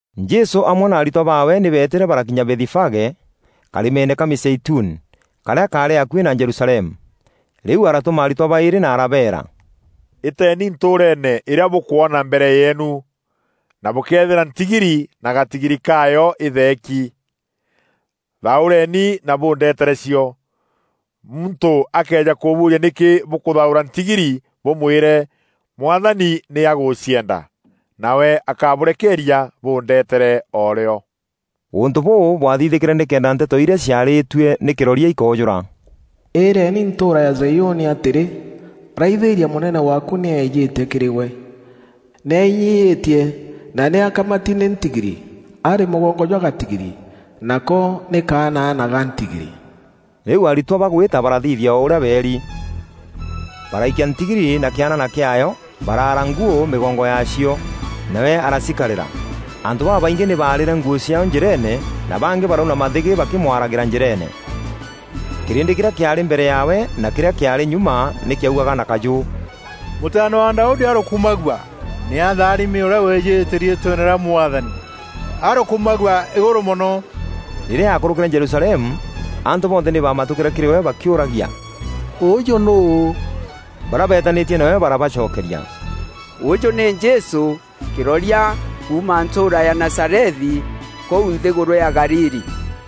Jesû amwe na aritwa baawe nî beetîre barakinya Bethifage, karîmeene ka mîzeituni, karîa kaarî akuî na Jerusalemu. Rîu aratûma aritwa baîrî na arabeera, “Îteeni ntûûreene îrîa bûkwona mbere yeenu, na bûkeethîra ntigiri na gatigiri kaayo itheeki. Thaûreeni na bûndeetere cio. Muntû akëeja kûbûûria nîkî bûkûthaûra ntigiri, bûmwîre, ‘Mwathani nî agûcienda.’ Nawe akabûrekeeria bûndetere o rîo.” Ûntû bûû bwaathithîkîre nîkenda nteto irîa ciarîîtue nî kîroria ikoojûra: “Îîreeni ntûûra ya Zaiûni atîrî, raithîîria mûnene waaku nî eejîte kîrî gwe! Nî ainyiîtie na nî akamati nî ntigiri, arî mûgongo jwa gatigiri, nako nî kaanaana ga ntigiri.” Rîu aritwa bagwîta barathithia o ûrîa beeri. Baraikia ntigiri na kîanaana kîaayo, baraara nguû mîgongo yaacio, nawe aracikarîra. Antû babaingî nî baarîre nguû ciaao njîreene na bangî barauna mathîgî bakîmwaragîra njîreene. Kîrîndî kîrîa kîaarî mbere yaawe na kîrîa kîaarî nyuma nî kîaugaga na kajû, “Mûtaana wa Daudi arokumagua! Nî atharimi ûrîa wîjîte riîtweene rîa Mwathani, Arokumagua îgûrû mono!” Rîrîa aakûrûkîre Jerusalemu, antû bonthe nî baamatûkîre kîrî we bakîûragia, “Ûjû nûû?” Barîa beetanîtie nawe barabacokeria, “Ûjû nî Jesû, kîroria kuuma ntûûra ya Nazarethi kûu nthîgûrû ya Galili.”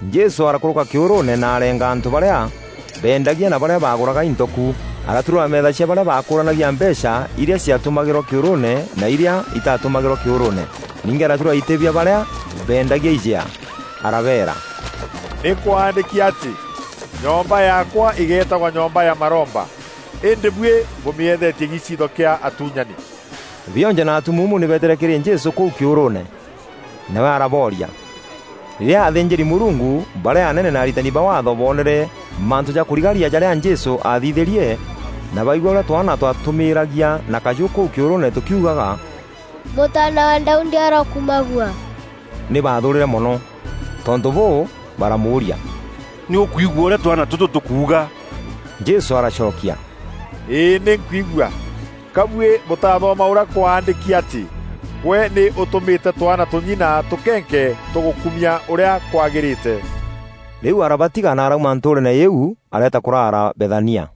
Jesû arakûrûka kîûrûûne na areenga antû barîa bendagia na barîa bagûraga into ku. Araturûra meetha cia barîa baakûranagia mbeecha irîa ciatumagîrwa kîûrûûne na irîa itatumagîrwa kîûrûûne. Ningî araturûra itî bia barîa beendagia ijea. Arabeera, “Nî kwaandîki atî, ‘Nyomba yaakwa îgeetagwa nyomba ya maromba,’ îndî buî bûmîethetie giiciitho kîa atuunyani.” Bionje na atumuumu nî beetîre kîrî Jesû kûu kîûrûûne, nawe arabooria. Rîrîa athînjîri-Mûrungu barîa anene na aritani ba Waatho boonere mantû ja kûrigaria jarîa Jesû aathithîrie, na baigua ûrîa twaana twatûmîîragia na kajû kûu kîûrûûne tûkiugaga, “Mûtaana wa Daudi arokumagua,” nî baathûûrîre mono. Tontû bûû, baramûûria, “Nî ûkwigua ûrîa twaana tûtû tûkuuga?” Jesû aracokia, “Îî nî nkwigua! Ka buî bûtathoma ûrîa kwaandîki atî, ‘Gwe nî ûtûmîte twaana tûnyi na tûkenke tûgûkumia ûrîa kwagîrîte.’” Rîu arabatiga na arauma ntûûreene îîu areeta kûrara Bethania.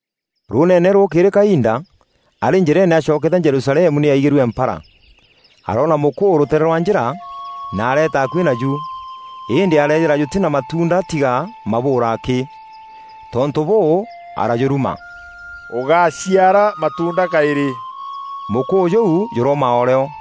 Rûûneene rûûkîrî kainda, arî njîreene acokeete Jerusalemu nî aigîrue mpara. Aroona mûkûû rûteere rwa njîra, na areeta akuî naju. Îndî areethîra jûtî na matuunda tiga mabûûra akî. Tontû bûû, arajûruma, “Ûgáciara matuunda kaîrî.” Mûkûû jûu jûrooma o rîo.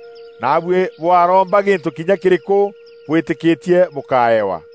Naabuî bwaromba gîntû kinya kîrîkû bwîtîkîtie bûkaewa.”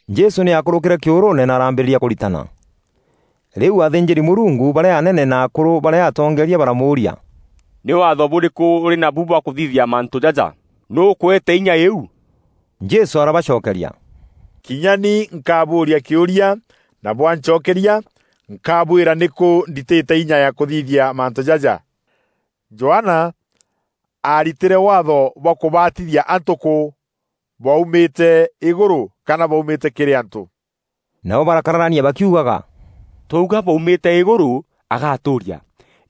Jesû nî aakûrûkîre kîûrûûne na arambîrîria kûritana. Rîu athînjîri-Mûrungu barîa anene na akûrû barîa atongeeria baramûûria, “Nî Waatho bûrîkû ûrî nabu bwa kûthithia mantû jaja? Nûû ûkûete inya îîu?” Jesû arabacokeria, “Kinya ni nkabûûria kîûria na bwancokeria, nkabwîra nîkû nditîte inya ya kûthithia mantû jaja. Johana aaritîre waatho bwa kûbatithia antû kû? Bwaumîte îgûrû kana bwaumîte kîrî antû?” Nabo barakararania bakiugaga, “Twauga, bwaumîte îgûrû, agatûûria,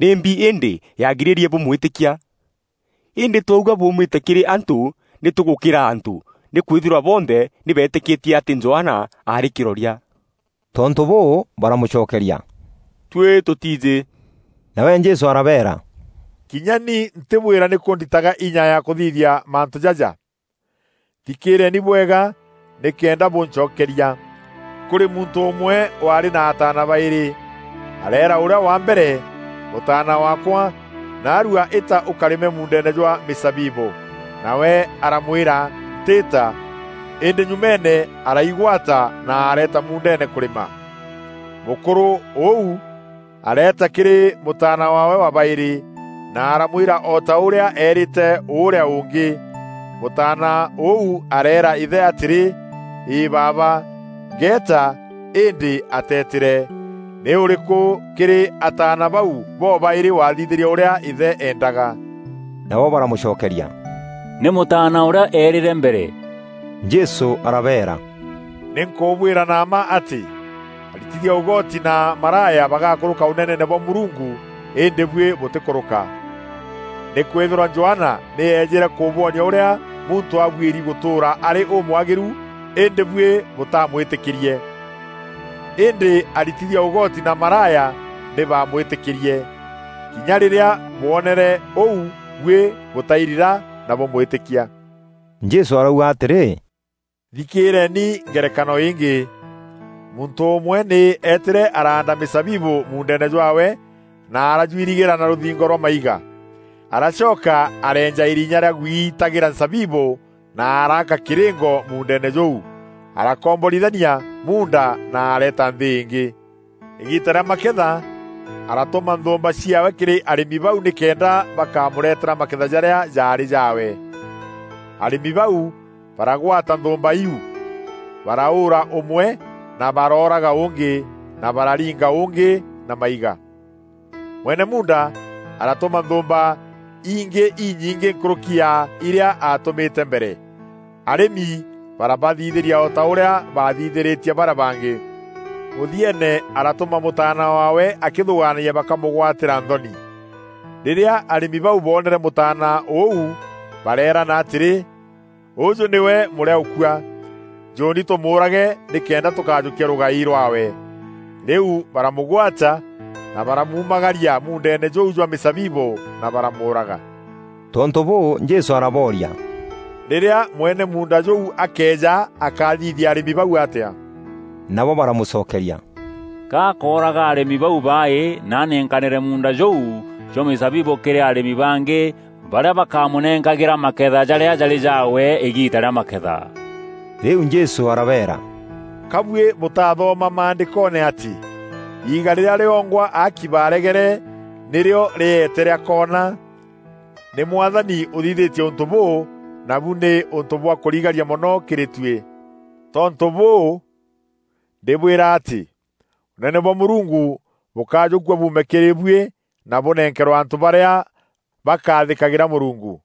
‘Nîmbi îndî yaagirîrie bûmwîtîkia?’ Îndî twauga, ‘Bwaumîte kîrî antû, nî tûgûkîra antû, nîkwîthîrwa bonthe nî beetîkîtie atî Johana aarî kîroria.’” Tontû bûû, baramûcokeria, “Tuî tûtiijî!” Nawe Jesû arabeera, “Kinya ni ntîbwîra nîkû nditaga inya ya kûthithia mantû jaja.” “Thikîîreeni bwega nîkenda bûncokeria: Kûrî muntû ûmwe waarî na ataana baîrî. Areera ûrîa wa mbere, ‘Mûtaana waakwa, naarua îta ûkarîme mûûndeene jwa mîzabibû.’ Nawe aramwîra, ‘Ntîîta!’ Îndî nyumeene araigwata na areeta muundeene kûrîma. Mûkûrû ûu areeta kîrî mûtaana waawe wa baîrî na aramwîra o ta ûrîa eerîte ûrîa ûngî. Mûtaana ûu areera îthe atîrî, ‘Îî baaba, ngeeta!’ Îndî ateetîre. Nî ûrîkû kîrî ataana bau bobaîrî wathithîrie ûrîa îthe eendaga?” Nabo baramûcokeria, “Nî mûtaana ûrîa eerîre mbere.” Jesû arabeera, “Nî nkûbwîra na mma atî, aritithia ûgoti na maraya bagakûrûka Ûneneene bwa Mûrungu îndî buî bûtîkûrûka. Nîkwîthîrwa Johana nî eejîre kûbwonia ûrîa muntû abuîri gûtûûra arî ûmwagîru îndî buî bûtamwîtîkîrie. Îndî aritithia ûgoti na maraya nî baamwîtîkîrie. Kinya rîrîa bwonere ûu buî bûtairira na bûmwîtîkia.” Jesû arauga atîrî, “Thikîîreeni ngerekano îngî: muntû ûmwe nî eetîre araanda mîzabibû muundeene jwaawe na arajwirigîra na rûthingo rwa maiga. Aracoka areenja îrinya rîa gwiitagîra nzabibû na araaka kîrîngo muundeene jûu. Arakomborithania muunda na areeta nthî îngî. Îgiita rîa maketha, aratûma nthûûmba ciaawe kîrî arîmi bau nîkenda bakamûretera maketha jarîa jaarî jaawe. Arîmi bau baragwata nthûûmba iu; baraûûra ûmwe, na barooraga ûûngî, na bararinga ûûngî na maiga. Mwene muunda aratûma nthûûmba ingî inyingî nkûrûki ya irîa aatûmîte mbere. Arîmi barabathithîria o ta ûrîa baathithîrîtie barîa bangî. Mûthieene aratûma mûtaana waawe akîthûgaanagia bakamûgwatîra nthoni. Rîrîa arîmi bau boonere mûtaana ûu bareerana atîrî, ‘Ûjû nîwe mûrîaûkua! Njûûni tûmûûrage nîkenda tûkajûkia rûgai rwaawe.’ Rîu, baramûgwata na baramuumagaria muundeene jûu jwa mîzabibû na baramûûraga.” Tontû bûû, Jesû arabooria, “Rîrîa mwene muunda jûu akeeja akathithia arîmi bau atîa?” Nabo baramûcokeria, “Ka akooraga arîmi bau baaî na anenkanîre muunda jûu jwa mîzabibû kîrî arîmi bangî barîa bakamûnenkagîra maketha jarîa jarî jaawe îgiita rîa maketha.” Rîu Jesû arabeera, “Ka buî bûtathoma maandîkoone atî: ‘Îîga rîrîa rîongwa aaki baaregere, nîrîo rîeete rîa koona. Nî Mwathani ûthithîtie ûntû bûû, nabu nî ûntû bwa kûrigaria mono kîrî tuî!’ “Tontû bûû, ndîbwîra atî Ûneene bwa Mûrungu bûkajûkua buume kîrî buî na bûnenkerwe antû barîa bakaathîkagîra Mûrungu. [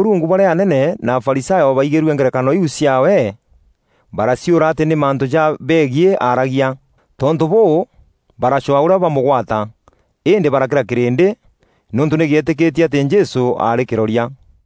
Rîrîa athînjîri-Mûrungu barîa anene na Afarisayo baigîrue ngerekano iu ciaawe, baraciûra atî nî mantû ja begiî aaragia. Tontû bûû, baracwaa ûrîa bamûgwata, îndî barakîra kîrîndî, nîûntû nî gîetîkîtie atî Jesû aarî kîroria.